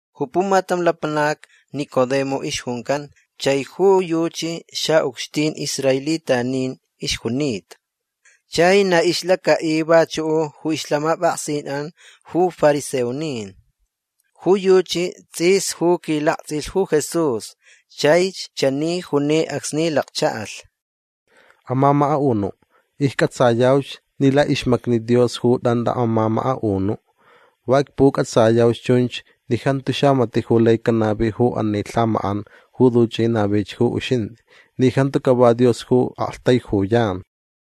Ju pumatam lapanac Nicodemo ixjuncan. Chai ju yuchi xaʼucxtin israelitanin ixjunita. Chai na ixlacaʼi vachuʼ ju ixlhamapʼaksinʼan ju fariseonin. Ju yuchi tsʼis ju quilaktsʼilh ju Jesús. Chaich chani juni acsni lakchaʼalh: ―Amamakaʼunuʼ iccʼatsayauch ni laʼixmacni Dios ju tʼantʼa amamakaʼunuʼ. Va icpucʼatsayauch chunch ni jantu xamatiʼ ju lai canavi ju ani lhamakʼan ju tuchʼi navich ju uxintʼi ni jantu cava Dios ju aktaijuyan.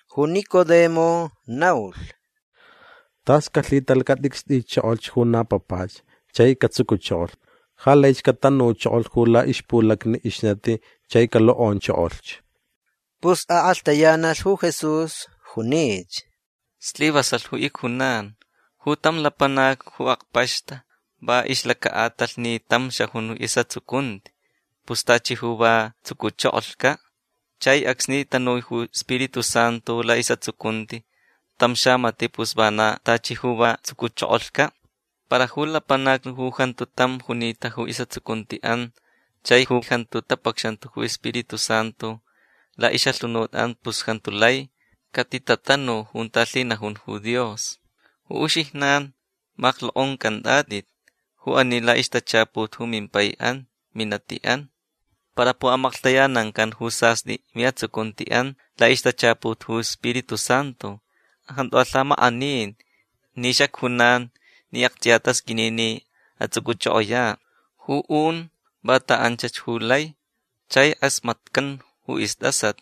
Ju Nicodemo naulh: ―Tas calhitalacatʼicstʼichokolh ju na papach chai catsucuchokolh. Ja laich catanuchokolh ju laʼixpulacni ixnati chai calokʼonchokolhch. Pus akʼalhtayanalh ju Jesús. Junich: ―Slivasalh ju icjunan. Ju tam lapanac ju akpaxta va ixlacaʼatalh ni tam xajun ju isʼatsucunti pus tachi ju va tsucuchokolhcaʼ. Chai acsni tanui ju Spiritu Santu laʼisʼatsucunti tam xamatiʼ pus vana tachi ju va tsucuchokolhcaʼ. Para ju lapanacni ju jantu tam junita ju isʼatsucuntiʼan chai ju jantu tapacxanta ju Spiritu Santu laʼixʼalhunutʼan pus jantu lai catitatanu junta lhinajun ju Dios. Ju uxijnan maklokʼoncʼantʼatʼit ju ani laʼixtachaput ju mimpaiʼan minatiʼan. Para puʼamaklhtayanancan ju sastʼi miʼatsucuntiʼan laʼixtachaput ju Spiritu Santu. Jantu alhamakʼanin ni xacjunan ni aktsʼiya tasqʼuini ni atsʼucʼuchʼokʼoyaʼ. Ju un vanta anchach ju lai. Chai kʼasmatcan ju istʼasat.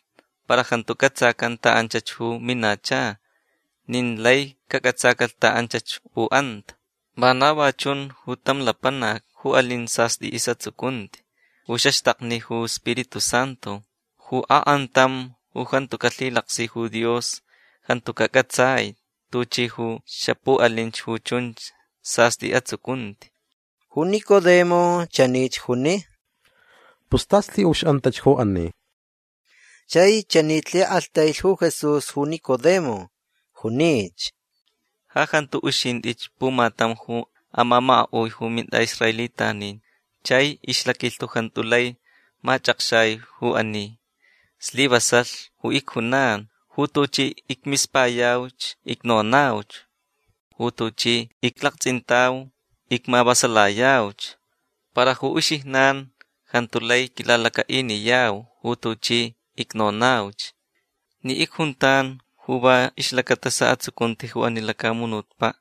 Para jantu cʼatsacan ta anchach ju minacha nin lai cacʼatsacalh ta anchach ju anta. Vana va chun ju tam lapanac ju alin sastʼi isʼatsucunti ju xaxtakni ju Spiritu Santu. Ju akʼantam ju jantucaʼ lhilaksi ju Dios jantucaʼ cʼatsai tuchi ju xapuʼalinch ju chunch sastʼi atsucunti. Ju Nicodemo chanich juni: ―Pus tas lhiʼucxʼantach ju ani. Chai chanich lhikʼalhtailh ju Jesús ju Nicodemo. Junich: ―Ja jantu uxintʼich pumatam ju amamakaʼui ju mintʼaʼisraelitanin chai ixlaquilhtu jantu lai machʼakxai ju ani. Slivasalh ju icjunan. Ju tuchi icmispayauch icnonauch. Ju tuchi iclaktsʼintau icmavasalayauch. Para ju uxijnan jantu lai quilalacaʼiniyau ju tuchi icnonauch. Ni icjuntan ju va ixlacata saʼatsucunti ju ani lacamunutpaʼ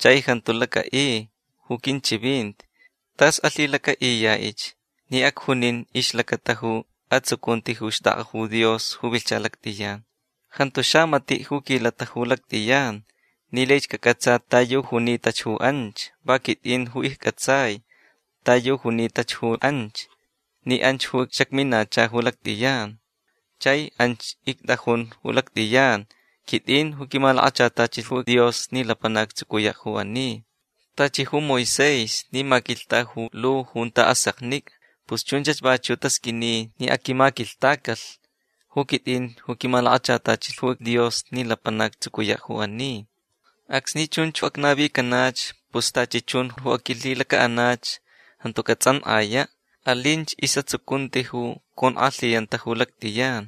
chai jantu lacʼaʼi ju quinchivinti tas alhilacʼaʼiyaʼich ni acjunin ixlacata ju atsucunti ju xtʼakʼa ju Dios ju vilhcha lactʼiyan. Jantu xamatiʼ ju quilata ju lactʼiyan ni laich cacʼatsa ta yu junitach ju anch. Va quitʼin ju iccʼatsai ta yu junitach ju anch ni anch ju xacminacha ju lactʼiyan. Chai anch ictʼajun ju lactʼiyan. Quitʼin ju quimalakachatachilh ju Dios ni lapanac actsucuyaʼ ju ani. Tachi ju Moisés ni maquilhta ju lu junta aseknicʼa pus chunchach vachuʼ tasqʼuini ni aquimaquilhtacalh ju quitʼin ju quimalakachatachilh ju Dios ni lapanac actsucuyaʼ ju ani. Acsni chunch acnavicanach pus tachi chun ju aquilhilacaʼanach jantu catsʼankʼayaʼ. Alinch isʼatsucunti ju conkʼalhiyanta ju lactʼiyan.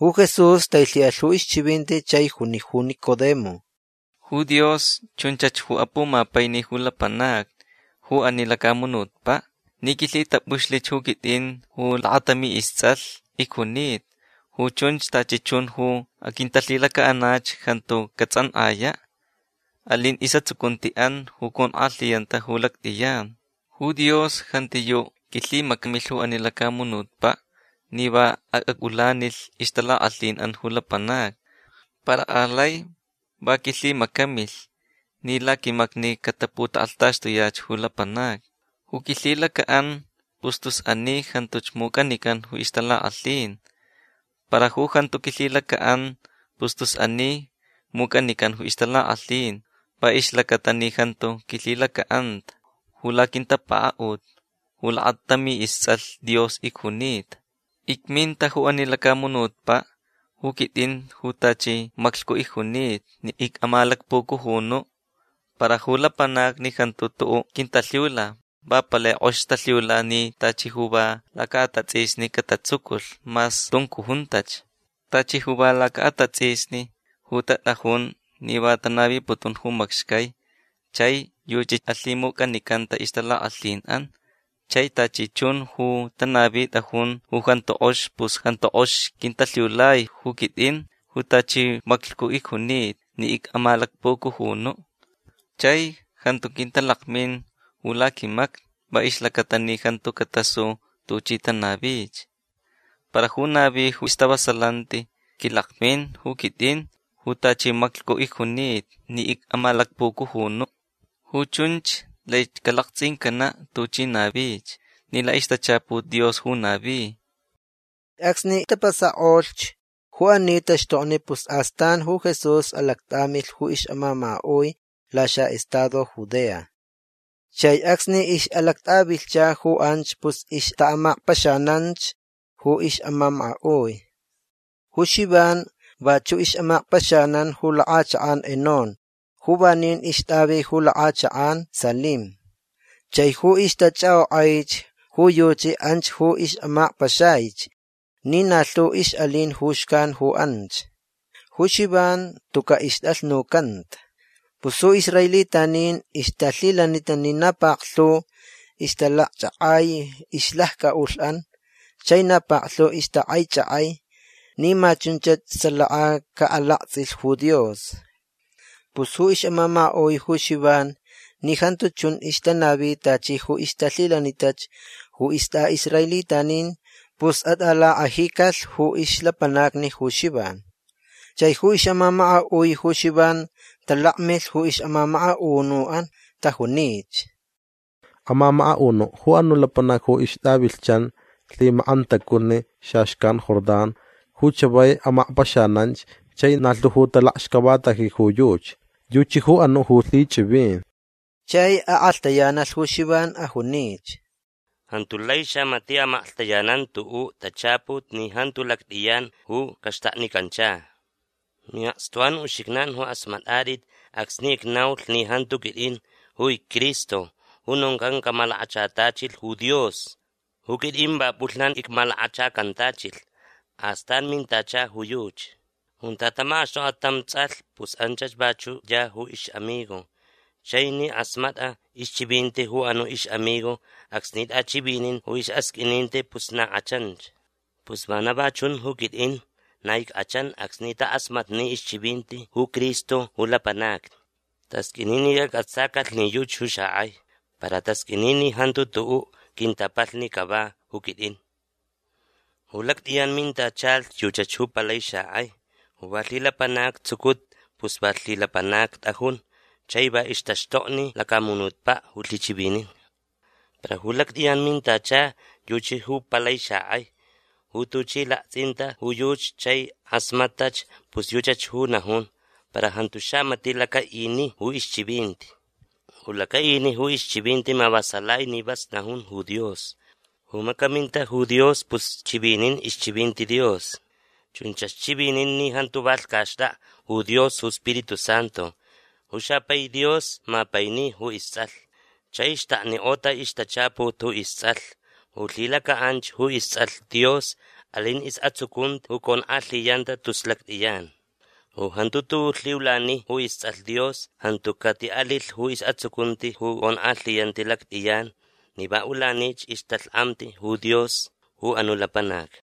Ju Jesús tailhiʼalh ju ixchivinti chai juni ju Nicodemo: ―Ju Dios chunchach ju apumapaini ju lapanacni ju ani lacamunutpaʼ ni quilhitapʼuxlh ju quitʼin ju lakatami istsʼalh icjunita. Ju chunch tachi chun ju aquintalhilacaʼanach jantu catsʼankʼayaʼ. Alin isʼatsucuntiʼan ju conkʼalhiyanta lactʼiyan. Ju Dios jantiyuʼ quilhimacamilh ju ani lacamunutpaʼ ni va acʼulanilh ixtalakʼalhinʼan ju lapanacni. Para alai va quilhimacamilh ni laquimacni cataputakʼalhtaxtuyach ju lapanacni. Ju quilhilacaʼan pus tus ani jantuch mucʼanican ju ixtalakʼalhin. Para ju jantu quilhilacaʼan pus tus ani mucʼanicanta ju ixtalakʼalhin va ixlacata ni jantu quilhilacaʼanta ju laquintapakaʼut ju lakatami istsʼalh Dios icjunita. Icminta ju ani lacamunutpaʼ ju quitʼin ju tachi maclhcu icjunita ni icʼamalacpucujunuʼ. Para ju lapanacni jantu tuʼuʼ quintalhiula. Va palai kʼox talhiula ni tachi ju va lacaʼatatsʼisni catatsuculh mas tuncujuntach. Tachi ju va lacaʼatatsʼisni ju tatʼajun ni va tanaviputun ju macxcai. Chai yuchi alhimucʼanicanta ixtalakʼalhinʼan. Chai tachi chun ju tanavitʼajun ju jantu kʼox pus jantu kʼox quintalhiulai ju quitʼin ju tachi maclhcu icjunita ni icʼamalacpucujunuʼ. Chai jantu quintalakmin ju laquimacni va ixlacata ni jantu catasu tuchi tanavich. Para ju navi ju stavasalanti quilakmin ju quitʼin ju tachi maclhcu icjunita ni icʼamalacpucujunuʼ. Ju chunch laich calaktsʼincanaʼ tuchi navich ni laʼixtachaput Dios ju navi. Acsni tapasakʼolhch ju ani taxtokni pus astan ju Jesús alactʼamilh ju ixʼamamakaʼui laxaʼestado Judea. Chai acsni ixʼalactʼavilhcha ju anch pus ixtaʼamakpaxananch ju ixʼamamakaʼui. Ju Xivan vachuʼ ixʼamakpaxanan ju lakʼachakʼan Enón ju vanin ixtʼavi ju lakʼachakʼan Salim. Chai ju ixtachʼakʼokʼaich ju yuchi anch ju ixʼamakpaxaich ni na lhu ixʼalin ju xcan ju anch. Ju Xivan tucaʼ ixtʼalhnucanta. Pus ju israelitanin ixtalhilanita ni na paklhu ixtalacchʼakʼai ixlaccʼaʼulhʼan chai na paklhu ixtakʼaichʼakʼai ni ma chunch salaka caʼalaktsʼilh ju Dios. Pus ju ixʼamamakaʼui ju Xivan ni jantu chun ixtanavi tachi ju ixtalhilanitach ju istʼaʼisraelitanin pus atʼalakʼajicalh ju ixlapanacni ju Xivan. Chai ju ixʼamamakaʼui ju Xivan talakmilh ju ixʼamamakaʼunuʼan. Tajunich: ―Amamakaʼunuʼ ju anuʼ lapanac ju ixtʼavilhchan lhimakʼantacutni xaxcan Jordán ju chavai amakpaxananch chai na lhu ju talakxcavataji ju yuchi. Yuchi ju anuʼ ju lhichʼivin. Chai akʼalhtayanalh ju Xivan. Ajunich: ―Jantu lai xamatiʼ amaklhtayanan tuʼuʼ tachaput ni jantu lactʼiyan ju caxtaknicancha. Miʼakstuʼan uxijnan ju kʼasmatʼatʼit acsni icnaulhch ni jantu quitʼin ju icCristo ju noncan camalakachatachilh ju Dios. Ju quitʼin va pʼulhnan icmalakachacantachilh. Astan mintacha ju yuchi. Junta tamakʼaxtʼokʼa tam tsʼalh pus anchach vachuʼ ya ju ixʼamigo chai ni kʼasmatʼa ixchivinti ju anuʼ ixʼamigo acsni tʼachivinin ju isʼasqʼuininti pus na kʼachanch. Pus vana va chun ju quitʼin. Na ickʼachan acsni takʼasmatni ixchivinti ju Cristo ju lapanacni. Tasqʼuini ni cacʼatsacalh ni yuchi ju xakʼai. Para tasqʼuini ni jantu tuʼuʼ quintapalhni cava ju quitʼin. Ju lactʼiyan mintachalh yuchach ju palai xakʼai. Ju va lhilapanac tsucuta pus va lhilapanac tʼajun chai va ixtaxtokni lacamunutpaʼ ju lhichivinin. Para ju lactʼiyan mintacha yuchi ju palai xakʼai. Ju tuchi laktsʼinta ju yuchi chai kʼasmatʼach pus yuchach ju najun. Para jantu xamatiʼ lacaʼini ju ixchivinti. Ju lacaʼini ju ixchivinti mavasalai ni vas najun ju Dios. Ju macaminta ju Dios pus chivinin ixchivinti Dios. Chunchach chivinin ni jantu va lhcaxtʼakʼa ju Dios ju Spiritu Santu. Ju xapai Dios mapaini ju istsʼalh. Chai xtaknikʼota ixtachaput ju istsʼalh. Ju lhilacaʼanch ju istsʼalh Dios alin isʼatsucunti ju conkʼalhiyanta tus lactʼiyan. Ju jantu tuʼuʼ lhiulani ju istsʼalh Dios jantu catiʼalilh ju isʼatsucunti ju conkʼalhiyanta lactʼiyan ni va ulanich ixtalhkʼamti ju Dios ju anuʼ lapanac.